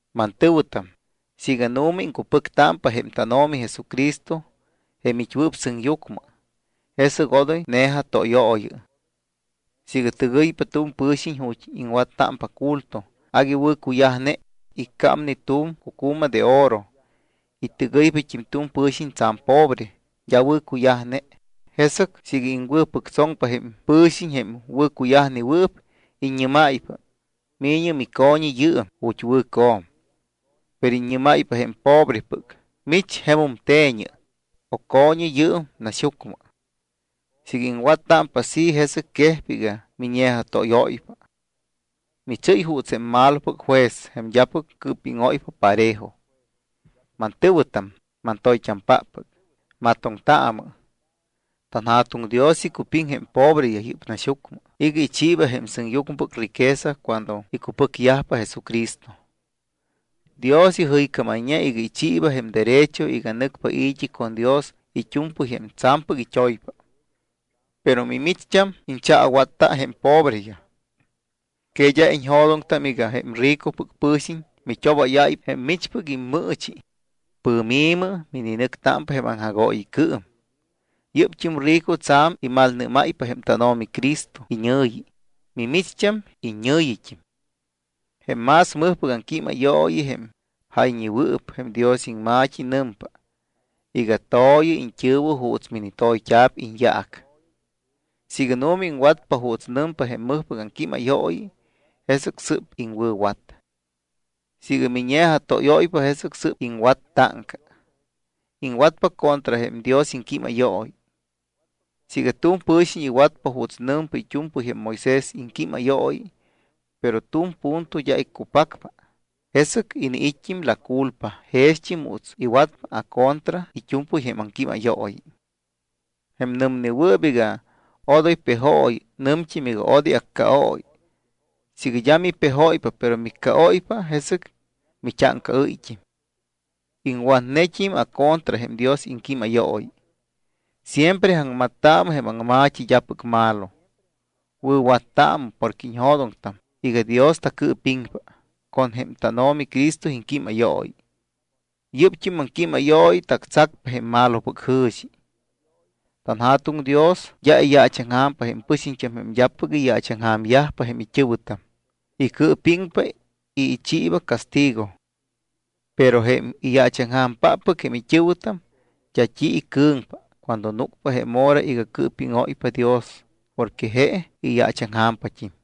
Mantɨ̱wɨtam, siiga nu̱ma iŋcupɨctámpa jém tánO̱mi Jesucristo jém it́wɨɨp sɨŋyucmɨ, jesɨc odoy ne̱jatóyooyɨ. Siiga tɨgɨypa tu̱m pɨ̱xiñ ju̱t́ iŋwattámpa culto agui wɨ̱cuyajne, iccámne tu̱m cucu̱ma de oro y tɨgɨypat́im tu̱m pɨ̱xiñ tsa̱m pobre, d́a wɨ̱cuyajne, jesɨc siiga iŋwɨ̱pɨctsoŋpa jém pɨ̱xiñ jém wɨ̱cuyajnewɨɨp y iññɨ́máypa: “Mi̱ñɨ mico̱ñi yɨɨm ju̱t́ wɨ̱co̱m.” Pero iññɨ́máypa jém pobrepɨc: “Mich jemum te̱ñɨ o co̱ñɨ yɨɨm naxyucmɨ.” Siiga iŋwattámpa así, jesɨc quejpa iga miñe̱jatóyóypa. Michɨ́y juuts jém malopɨc juez jém d́apɨc cɨɨpíŋóypa parejo. Mantɨ̱wɨtam mantoyt́ampáppɨc, matoŋtaamɨ. TanJa̱tuŋ Dios icupiŋ jém pobreyaj yɨ́p naxyucmɨ iga ichiiba jém sɨŋyucmɨpɨc riqueza cuando icupɨcyajpa Jesucristo. Dios ijɨycámayñe iga ichiiba jém derecho iga nɨcpa i̱t́i con Dios it́u̱mpɨy jém tsa̱mpɨc it́oyyajpa. Pero mimicht́am iñchaawatta jém pobreyaj. ¿Que d́a iñjo̱doŋtam iga jém ricopɨc pɨ̱xiñ mit́obáyáypa jém michpɨc immɨɨchi, pɨ̱mi̱mɨ mininɨcpa jém aŋjagooyicɨɨm? Yɨ́pt́im rico tsa̱m imalnɨ́máypa jém tánO̱mi Cristo iñɨ̱yi, mimicht́am iññɨ̱yit́im. Jém más mɨjpɨc aŋquímayooyi, jém jayñewɨɨp jém Dios iŋma̱t́i, nɨmpa iga: “To̱yɨ iñt́ɨ̱wɨ juuts minitoyt́a̱p iñyaac.” Siiga nu̱ma iŋwatpa juuts nɨmpa jém mɨjpɨc aŋquímayooyi, jesɨc sɨ́p iŋwɨ̱wat. Siiga miñe̱jatóyóypa, jesɨc sɨ́p iŋwat táŋca. Iŋwatpa contra jém Dios iŋquímayooyi. Siiga tu̱m pɨ̱xiñ iwatpa juuts nɨmpa it́u̱mpɨy jém Moisés iŋquímayooyi, pero tu̱m punto d́a iccupacpa, jesɨc iniit́t́im la culpa jext́im juuts iga iwatpa acontra it́u̱mpɨy jém aŋquímayooyi. Jém nɨmnewɨɨp iga: Odoy pejooyɨ, nɨmt́im iga: Odoy accaooyɨ. Siiga d́a mipejóypa, pero miccaóypa, jesɨc mit́áŋcaɨ́yt́im. Iŋwatnet́im acontra jém Dios iŋquímayooyi. Siempre aŋmattaamɨ jém aŋma̱t́i d́apɨc malo. Wɨ̱wattaamɨ porque iñjo̱doŋtam iga Dios tacɨɨpiŋpa con jém tánO̱mi Cristo iŋquímayooyi. Yɨ́pt́im aŋquímayooyi tactsacpa jém malopɨc jɨ̱xi. TanJa̱tuŋ Dios d́a iyaachaŋja̱mpa jém pɨxiñt́am jém d́apɨc iyaachaŋja̱myajpa jém it́ɨ̱wɨtam, icɨɨpiŋpa y ichiiba castigo. Pero jém iyaachaŋja̱mpáppɨc jém it́ɨ̱wɨtam, d́a t́i icɨ̱ŋpa cuando núcpa jém hora iga cɨɨpíŋóypa Dios porque je iyaachaŋja̱mpat́im.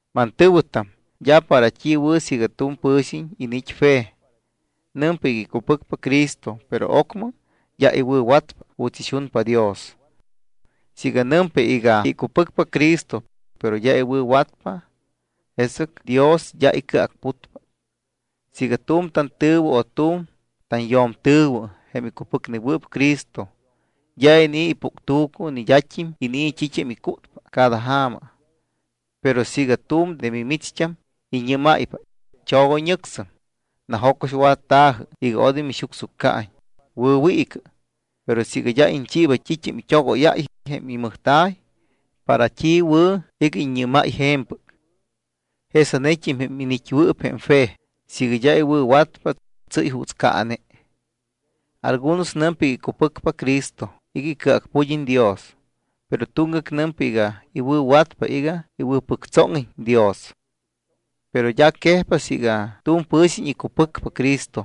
Mantɨ̱wɨtam, d́a para t́i wɨ̱ siiga tu̱m pɨ̱xiñ iniit́ fe, nɨmpa iga icupɨcpa Cristo, pero ocmɨ d́a iwɨ̱watpa juuts ixunpa Dios. Siiga nɨmpa iga icupɨcpa Cristo, pero d́a iwɨ̱watpa, jesɨc Dios d́a icɨacputpa. Siiga tu̱m tantɨ̱wɨ o tu̱m tanyo̱mtɨ̱wɨ, jém icupɨcnewɨɨp Cristo, d́a inii̱ ipuctu̱cu ni d́at́im inii̱ t́it́am icútpa cada ja̱ma, pero siiga tu̱m de mimicht́am iññɨ́máypa: “Chogoyñɨcsɨm, najo̱coxwatta̱jɨ iga odoy mixucsuccaiñ, wɨ̱wiicɨ”, pero siiga d́a iñchiiba t́it́am it́ogóyáy jém imɨjta̱y, ¿para t́i wɨ̱ iga iññɨ́máy je̱mpɨc? Jesanet́im jém iniit́wɨɨp jém fe, siiga d́a iwɨ̱watpa, tsɨ́y juuts caane. Algunos nɨmpa iga icupɨcpa Cristo iga icɨacpud́iñ Dios. Pero tuŋgac nɨmpa iga iwɨ̱watpa iga iwɨ̱pɨctsóŋiñ Dios. Pero d́a quejpa siiga tu̱m pɨ̱xiñ icupɨcpa Cristo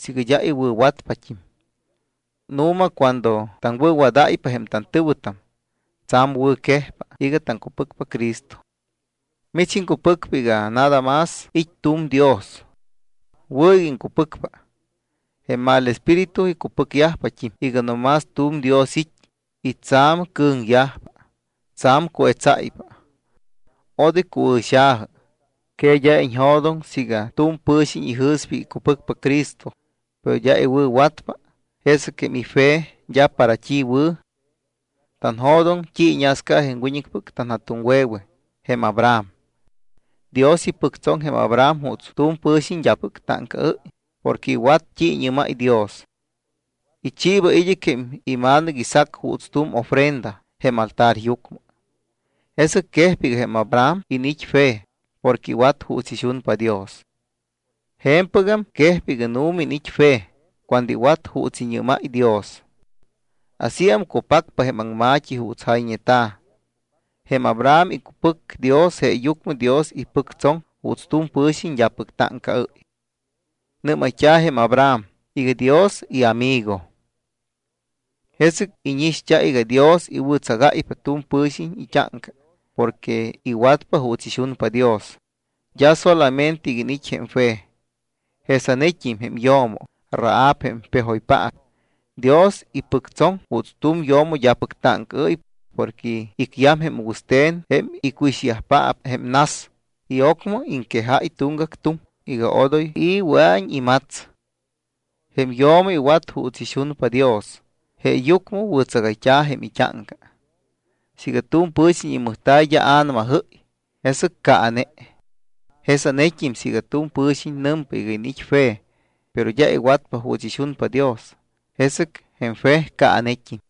siiga d́a iwɨ̱watpat́im. Nu̱ma cuando taŋwɨ̱wadáypa jém tantɨ̱wɨtam, tsa̱m wɨ̱quejpa iga taŋcupɨcpa Cristo. Mich iŋcupɨcpa iga nada más it́ tu̱m Dios. Wɨ̱ iga iŋcupɨcpa. Jém mal espíritu icupɨcyajpat́im iga no más tu̱m Dios it́ y tsa̱m cɨ̱ŋyajpa, tsa̱m cuetsáypa. Odoy cuɨ̱xa̱jɨ, ¿que d́a iñjo̱doŋ siiga tu̱m pɨ̱xiñ ijɨ̱spa iga icupɨcpa Cristo, pero d́a iwɨ̱watpa, jesɨc jém ife d́a para t́i wɨ̱? Tanjo̱doŋ t́i iñasca jém wiñɨcpɨc tanja̱tuŋwe̱we jém Abraham. Dios ipɨctsoŋ jém Abraham juuts tu̱m pɨ̱xiñ d́apɨc táŋcaɨ́y porque iwat t́i iñɨ́máy Dios. Ichiiba id́ɨc jém ima̱nɨc Isaac juuts tu̱m ofrenda jém altaryucmɨ. Jesɨc quejpa iga jém Abraham iniit́ fe porque iwat juuts ixunpa Dios. Je̱mpɨgam quejpa iga nu̱ma iniit́ fe cuando iwat juuts iñɨ́máy Dios. Asíam cupacpa jém aŋma̱t́i juuts jayñeta̱: “Jém Abraham icupɨc Dios jeeyucmɨ Dios ipɨctsoŋ juuts tu̱m pɨ̱xiñ d́apɨc táŋcaɨ́y. Nɨ́mayt́a̱ jém Abraham iga Dios iamigo.” Jesɨc íñixt́a iga Dios iwɨ̱tsagáypa tu̱m pɨ̱xiñ it́áŋca porque iwatpa juuts ixunpa Dios, d́a solamente iga iniit́ jém fe. Jesa̱t́im jém yo̱mo Rahab, jém pejoypaap, Dios ipɨctsoŋ juuts tu̱m yo̱mo d́apɨc táŋcaɨ́y porque icyam jém wɨste̱n jém icuixayyajpaap jém nas y ocmɨ iŋquejáy tuŋgac tuŋ iga odoy i̱ wɨa̱iñ imats. Jém yo̱mo iwat juuts ixunpa Dios, jeeyucmɨ wɨ̱tsagayt́a̱ jém it́áŋca. Siiga tu̱m pɨ̱xiñ imɨjta̱y d́a a̱namajɨ́y, jesɨc caane. Jesanet́im siiga tu̱m pɨ̱xiñ nɨmpa iga iniit́ fe, pero d́a iwatpa juuts ixunpa Dios, jesɨc jém fe caanet́im.